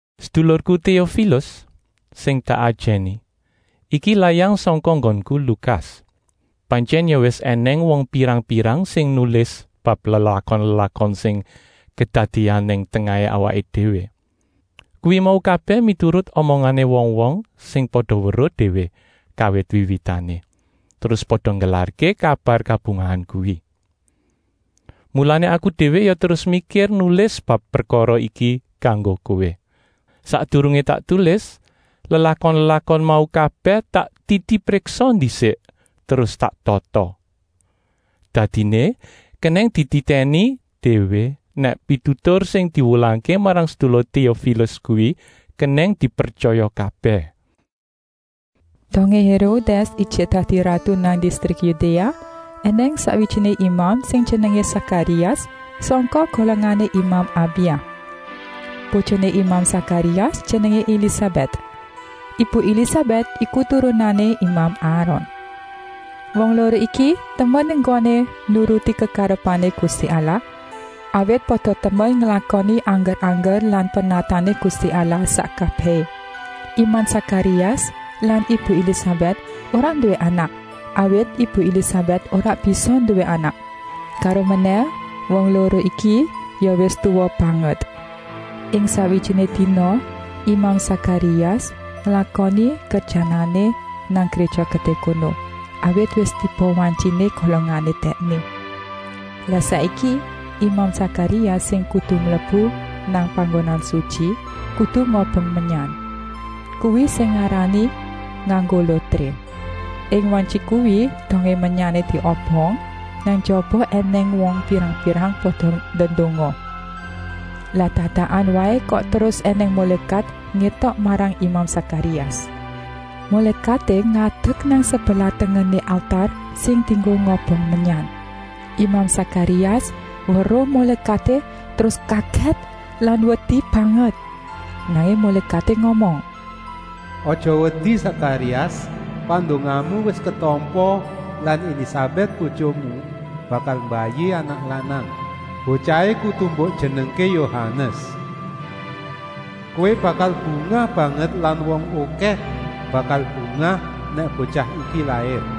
Sedulurku Téofilus sing tak ajèni, iki layang sangka nggonku, Lukas. Pantyèn ya wis ènèng wong pirang-pirang sing nulis bab lelakon-lelakon sing kedadéan nang tengahé awaké déwé. Kuwi mau kabèh miturut omongané wong-wong sing pada weruh déwé kawit wiwitané, terus pada nggelarké kabar kabungahan kuwi. Mulané aku déwé ya terus mikir nulis bab prekara iki kanggo kowé. Sakdurungé tak tulis, lelakon-lelakon mau kabèh tak titipriksa ndisik, terus tak tata. Dadiné kenèng dititèni déwé nèk pitutur sing diwulangké marang sedulur Téofilus kuwi kenèng dipretyaya kabèh. Dongé Hérodès ijik dadi ratu nang distrik Yudéa, ènèng sakwijiné imam sing jenengé Sakarias, sangka golongané imam Abia. Bojoné imam Sakarias jenengé Elisabèt. Ibu Elisabèt iki turunané imam Aron. Wong loro iki temen enggoné nuruti kekarepané Gusti Allah, awit pada temen nglakoni angger-angger lan pernatané Gusti Allah sak kabèhé. Imam Sakarias lan ibu Elisabèt ora nduwé anak, awit ibu Elisabèt ora bisa nduwé anak. Karomenèh wong loro iki ya wis tuwa banget. Ing sakwijiné dina imam Sakarias nglakoni kerjanané nang Gréja Gedé kono, awit wis tiba wantyiné golongané dèkné. Lah saiki imam Sakarias sing kudu mlebu nang Panggonan Sutyi, kudu ngobong menyan. Kuwi sing ngarani nganggo lotré. Ing wantyi kuwi, dongé menyané diobong, nang njaba ènèng wong pirang-pirang pada ndedonga. Lah dadakan waé kok terus ènèng mulékat ngétok marang imam Sakarias. Mulékaté ngadek nang sebelah tengené altar sing dienggo ngobong menyan. Imam Sakarias weruh mulékaté terus kagèt lan wedi banget. Nanging mulékaté ngomong: “Aja wedi, Sakarias! Pandongamu wis ketampa lan Elisabèt, bojomu, bakal mbayi anak lanang. Botyahé kudu mbok jenengké Yohanes. Kowé bakal bungah banget lan wong okèh bakal bungah nèk botyah iki lair.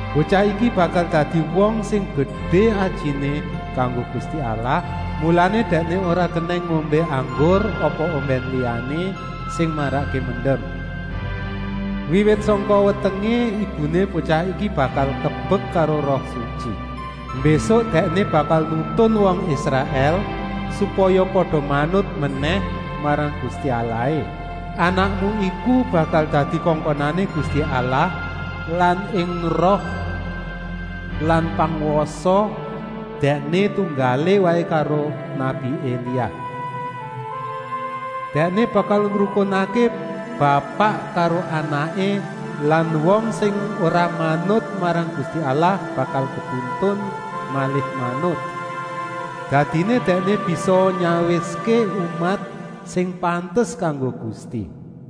Botyah iki bakal dadi wong sing gedé ajiné kanggo Gusti Allah, mulané dèkné ora kenèng ngombé anggur apa ombèn liyané sing marakké mendem. Wiwit sangka wetengé ibuné botyah iki bakal kebek karo Roh Sutyi. Mbésuk dèkné bakal nuntun wong Israèl, supaya pada manut menèh marang Gusti Allahé. Anakmu iku bakal dadi kongkonané Gusti Allah lan ing roh lan pangwasa dèkné tunggalé waé karo nabi Elia. Dèkné bakal ngrukunké bapak karo anaké lan wong sing ora manut marang Gusti Allah bakal katuntun malih manut. Dadiné dèkné bisa nyawiské umat sing pantes kanggo Gusti.”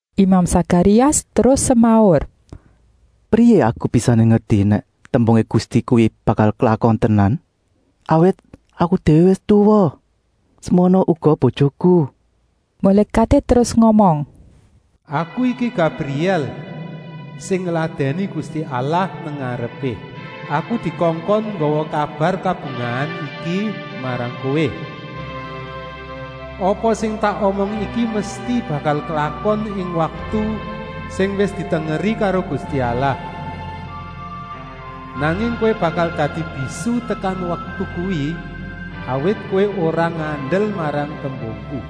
Imam Sakarias terus semaur: “Kepriyé aku bisané ngerti nèk tembungé Gusti kuwi bakal klakon tenan, awit aku déwé wis tuwa, semono uga bojoku?” Mulékaté terus ngomong: “Aku iki Gabrièl sing ngladèni Gusti Allah nang ngarepé. Aku dikongkon nggawa kabar kabungahan iki marang kowé. Apa sing tak omong iki mesti bakal klakon ing waktu sing wis ditengeri karo Gusti Allah. Nanging kowé bakal dadi bisu tekan waktu kuwi, awit kowé ora ngandel marang tembungku.”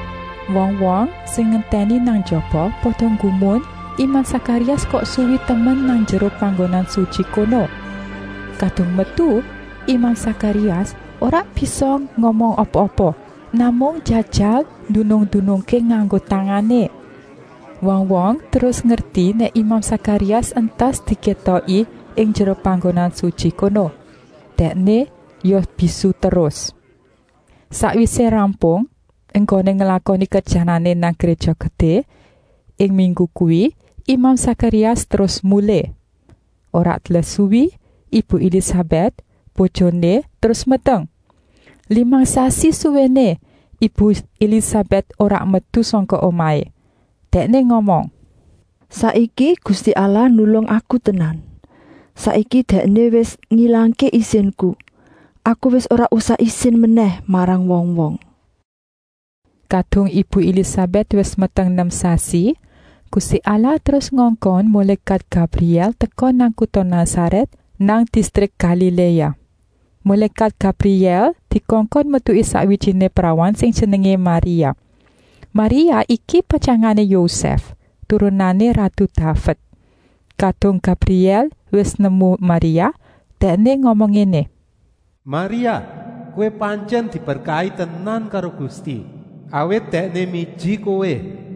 Wong-wong sing ngentèni nang njaba pada nggumun imam Sakarias kok suwi temen nang njero Panggonan Sutyi kono. Kadung metu, imam Sakarias ora bisa ngomong apa-apa, namung njajal ndunung-ndunungké nganggo tangané. Wong-wong terus ngerti nèk imam Sakarias entas dikétoki ing njero Panggonan Sutyi kono. Dèkné ya bisu terus. Sakwisé rampung enggoné nglakoni kerjanané nang Gréja Gedé ing minggu kuwi, imam Sakarias terus mulih. Ora let suwi ibu Elisabèt, bojoné, terus meteng. Limang sasi suwéné ibu Elisabèt ora metu sangka omahé. Dèkné ngomong: “Saiki Gusti Allah nulung aku tenan. Saiki Dèkné wis ngilangké isinku, aku wis ora usah isin menèh marang wong-wong.” Kadung ibu Elisabèt wis meteng nem sasi, Gusti Allah terus ngongkon mulékat Gabrièl teka nang kuta Nasarèt nang distrik Galiléa. Mulékat Gabrièl dikongkon metuki sakwijiné prawan sing jenengé Maria. Maria iki patyangané Yosèf, turunané ratu Daved. Kadung Gabrièl wis nemu Maria, dèkné ngomong ngéné: “Maria, kowé pantyèn diberkahi tenan karo Gusti, awit Dèkné miji kowé.”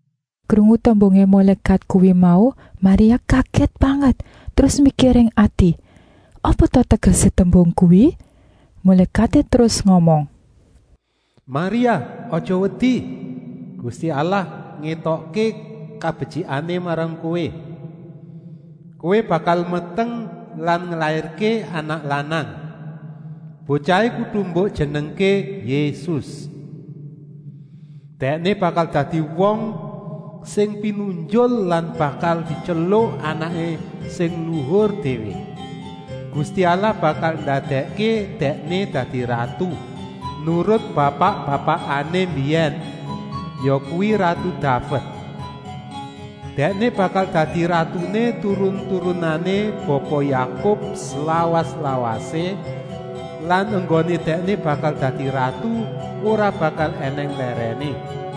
Krungu tembungé mulékat kuwi mau Maria kagèt banget, terus mikir ing ati: “Apa ta tegesé tembung kuwi?” Mulékaté terus ngomong: “Maria, aja wedi! Gusti Allah ngétokké kabetyikané marang kowé. Kowé bakal meteng lan nglairké anak lanang. Botyahé kudu mbok jenengké Yésus. Dèkné bakal dadi wong sing pinunjul lan bakal dityeluk Anaké Sing Luhur Déwé. Gusti Allah bakal ndadèkké Dèkné dadi ratu, nurut bapak-bapakané mbiyèn, yakuwi ratu Daved. Dèkné bakal dadi ratuné turun-turunané Bapa Yakub slawas-lawasé lan enggoné Dèkné bakal dadi ratu ora bakal ènèng lèrèné.”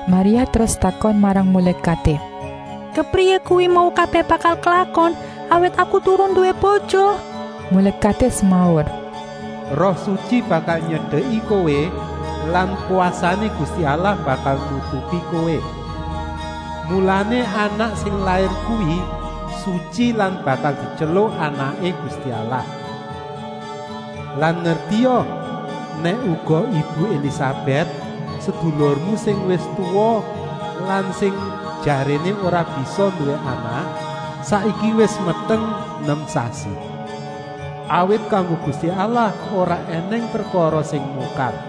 Maria terus takon marang mulékaté: “Kepriyé kuwi mau kabèh bakalé klakon, awit aku durung nduwé bojo?” Mulékaté semaur: “Roh Sutyi bakal nyedeki kowé lan kwasané Gusti Allah bakal nutupi kowé. Mulané anak sing lair kuwi sutyi lan bakal dityeluk Anaké Gusti Allah. Lan ngertia nèk uga ibu Elisabèt, sedulurmu sing wis tuwa lan sing jaréné ora bisa nduwé anak, saiki wis meteng nem sasi. Awit kanggo Gusti Allah ora ènèng prekara sing mokal.”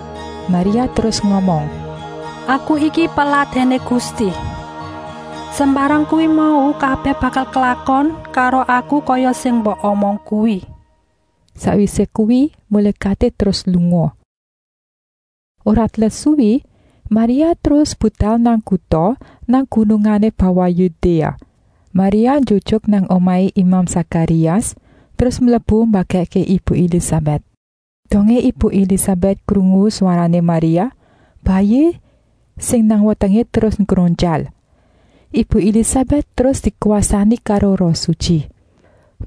Maria terus ngomong: “Aku iki peladèné Gusti. Sembarang kuwi mau kabèh bakal klakon karo aku kaya sing mbok omong kuwi.” Sakwisé kuwi mulékaté terus lunga. Ora let suwi Maria terus budal nang kuta nang gunungané bawah Yudéa. Maria njujuk nang omahé imam Sakarias, terus mlebu mbagèkké ibu Elisabèt. Dongé ibu Elisabèt krungu swarané Maria, bayi sing nang wetengé terus nggronjal. Ibu Elisabèt terus dikwasani karo Roh Sutyi.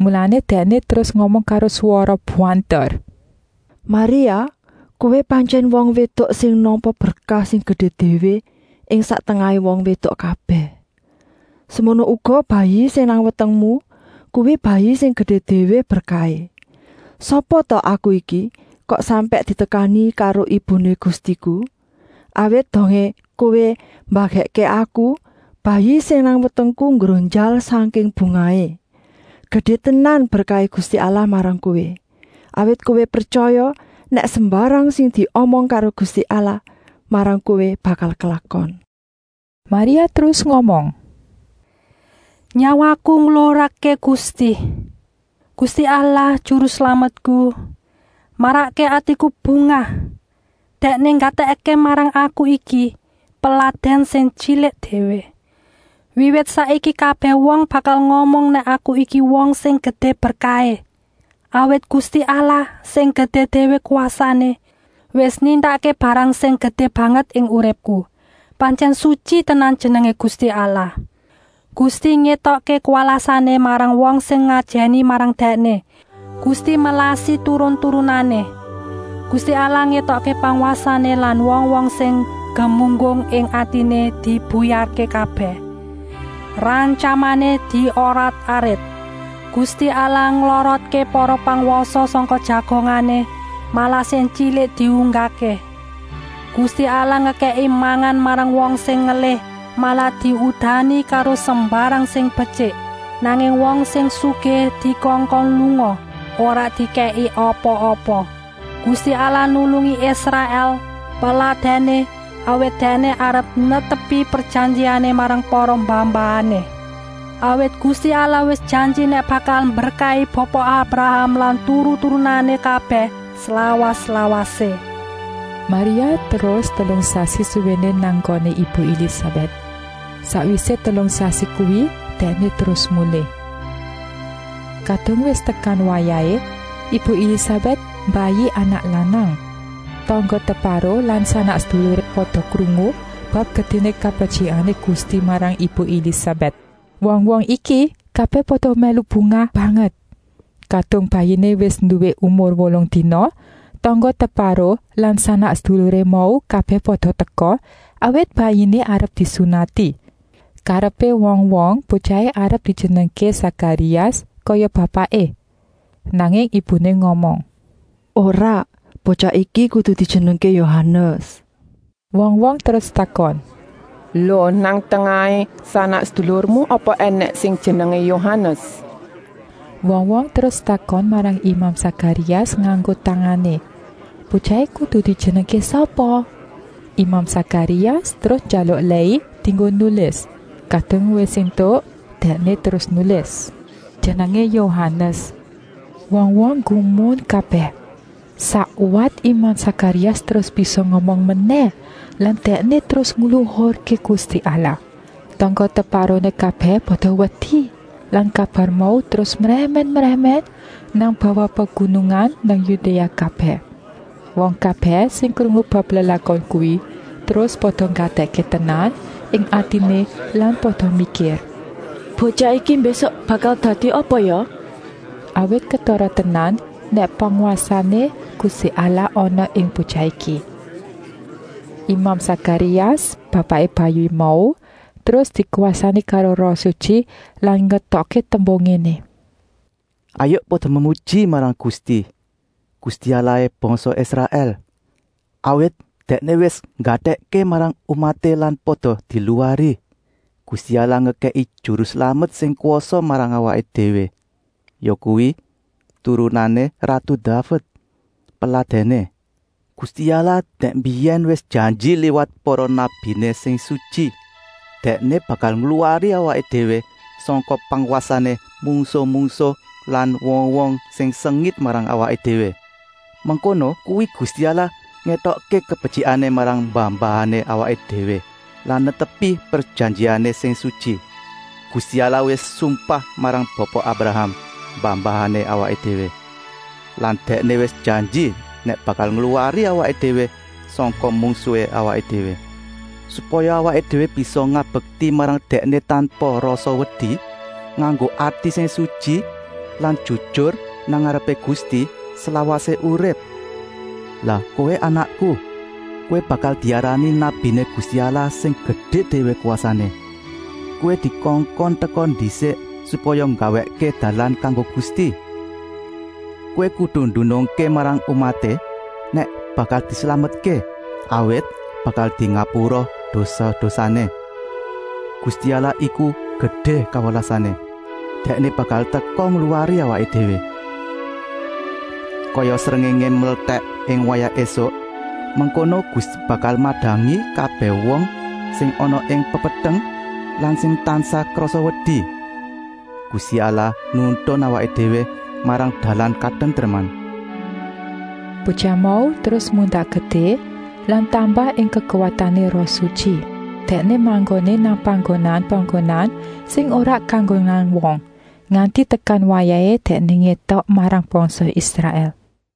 Mulané dèkné terus ngomong karo swara banter: “Maria, kowé pantyèn wong wédok sing nampa berkah sing gedé déwé ing sak tengahé wong wédok kabèh. Semono uga bayi sing nang wetengmu, kuwi bayi sing gedé déwé berkahé. Sapa ta aku iki, kok sampèk ditekani karo ibuné Gustiku? Awit dongé kowé mbagèkké aku, bayi sing nang wetengku nggronjal sangking bungahé. Gedé tenan berkahé Gusti Allah marang kowé, awit kowé pretyaya nèk sembarang sing diomong karo Gusti Allah marang kowé bakal klakon.” Maria terus ngomong: “Nyawaku ngluhurké Gusti! Gusti Allah, Juru Slametku, marakké atiku bungah. Dèkné nggatèkké marang aku iki, peladèn sing tyilik déwé. Wiwit saiki kabèh wong bakal ngomong nèk aku iki wong sing gedé berkahé. Awit Gusti Allah, sing gedé déwé kwasané, wis nindakké barang sing gedé banget ing uripku. Pantyèn sutyi tenan jenengé Gusti Allah. Gusti ngétokké kawelasané marang wong sing ngajèni marang Dèkné, Gusti melasi turun-turunané. Gusti Allah ngétokké pangwasané lan wong-wong sing gemunggung ing atiné dibuyarké kabèh. Rantyamané diorat-arit. Gusti Allah nglorotké para pangwasa sangka jagongané, malah sing tyilik diunggahké. Gusti Allah ngekèki mangan marang wong sing ngelih, malah diudani karo sembarang sing betyik, nanging wong sing sugih dikongkon lunga, ora dikèki apa-apa. Gusti Allah nulungi Israèl, peladèné, awit Dèkné arep netepi prejanjiané marang para mbah-mbahané. Awit Gusti Allah wis janji nèk bakal mberkahi Bapa Abraham lan turun-turunané kabèh, slawas-lawasé.” Maria terus telung sasi suwéné nang nggoné ibu Elisabèt. Sakwisé telung sasi kuwi dèkné terus mulih. Kadung wis tekan wayahé, ibu Elisabèt mbayi anak lanang. Tangga-teparo lan sanak-seduluré pada krungu bab gedéné kabetyikané Gusti marang ibu Elisabèt. Wong-wong iki kabèh pada mèlu bungah banget. Kadung bayiné wis nduwé umur wolung dina, tangga-teparo lan sanak-seduluré mau kabèh pada teka, awit bayiné arep disunati. Karepé wong-wong botyahé arep dijenengké Sakarias, kaya bapaké. Nanging ibuné ngomong: “Ora, botyah iki kudu dijenengké Yohanes!” Wong-wong terus takon: “Lo, nang tengahé sanak-sedulurmu apa ènèng sing jenengé Yohanes?” Wong-wong terus takon marang imam Sakarias nganggo tangané, botyahé kudu dijenengké sapa. Imam Sakarias terus njaluk lèi dienggo nulis. Kadung wis éntuk dèkné terus nulis: “Jenengé Yohanes!” Wong-wong nggumun kabèh. Sakwat imam Sakarias terus bisa ngomong menèh lan dèkné terus ngluhurké Gusti Allah. Tangga-teparoné kabèh pada wedi lan kabar mau terus mrèmèn-mrèmèn nang bawah pegunungan nang Yudéa kabèh. Wong kabèh sing krungu bab lelakon kuwi terus pada nggatèkké tenan ing atiné lan pada mikir: “Botyah iki mbésuk bakal dadi apa ya?” Awit ketara tenan nèk pangwasané Gusti Allah ana ing botyah iki. Imam Sakarias, bapaké bayi mau, terus dikwasani karo Roh Sutyi lan ngetokké tembung ngéné: “Hayuk pada memuji marang Gusti, Gusti Allahé bangsa Israèl! Awit Dèkné wis nggatèkké marang umaté lan pada diluwari. Gusti Allah ngekèki Juru Slamet sing kwasa marang awaké déwé, yakuwi turunané ratu Daved, peladèné. Gusti Allah dèk mbiyèn wis janji liwat para nabiné sing sutyi. Dèkné bakal ngluwari awaké déwé sangka pangwasané mungsuh-mungsuh lan wong-wong sing sengit marang awaké déwé. Mengkono kuwi Gusti Allah ngétokké kabetyikané marang mbah-mbahané awaké déwé lan netepi prejanjiané sing sutyi. Gusti Allah wis sumpah marang Bapa Abraham, mbah-mbahané awaké déwé lan Dèkné wis janji nèk bakal ngluwari awaké déwé sangka mungsuhé awaké déwé. Supaya awaké déwé bisa ngabekti marang Dèkné tanpa rasa wedi, nganggo ati sing sutyi lan jujur nang ngarepé Gusti, slawasé urip. Lah kowé anakku, kowé bakal diarani nabiné Gusti Allah sing gedé déwé kwasané. Kowé dikongkon teka ndisik, supaya nggawèkké dalan kanggo Gusti. Kowé kudu ndunungké marang umaté, nèk bakal dislametké, awit bakal dingapura dosa-dosané. Gusti Allah iku gedé kawelasané. Dèkné bakal teka ngluwari awaké déwé. Kaya srengéngé mletèk ing wayah ésuk, mengkono Gusti bakal madangi kabèh wong sing ana ing pepeteng lan sing tansah krasa wedi. Gusti Allah nuntun awaké déwé marang dalan katentreman.” Botyah mau terus mundak gedé lan tambah ing kekuwatané Roh Sutyi. Dèkné manggoné nang panggonan-panggonan sing ora kanggonan wong, nganti tekan wayahé dèkné ngétok marang bangsa Israèl.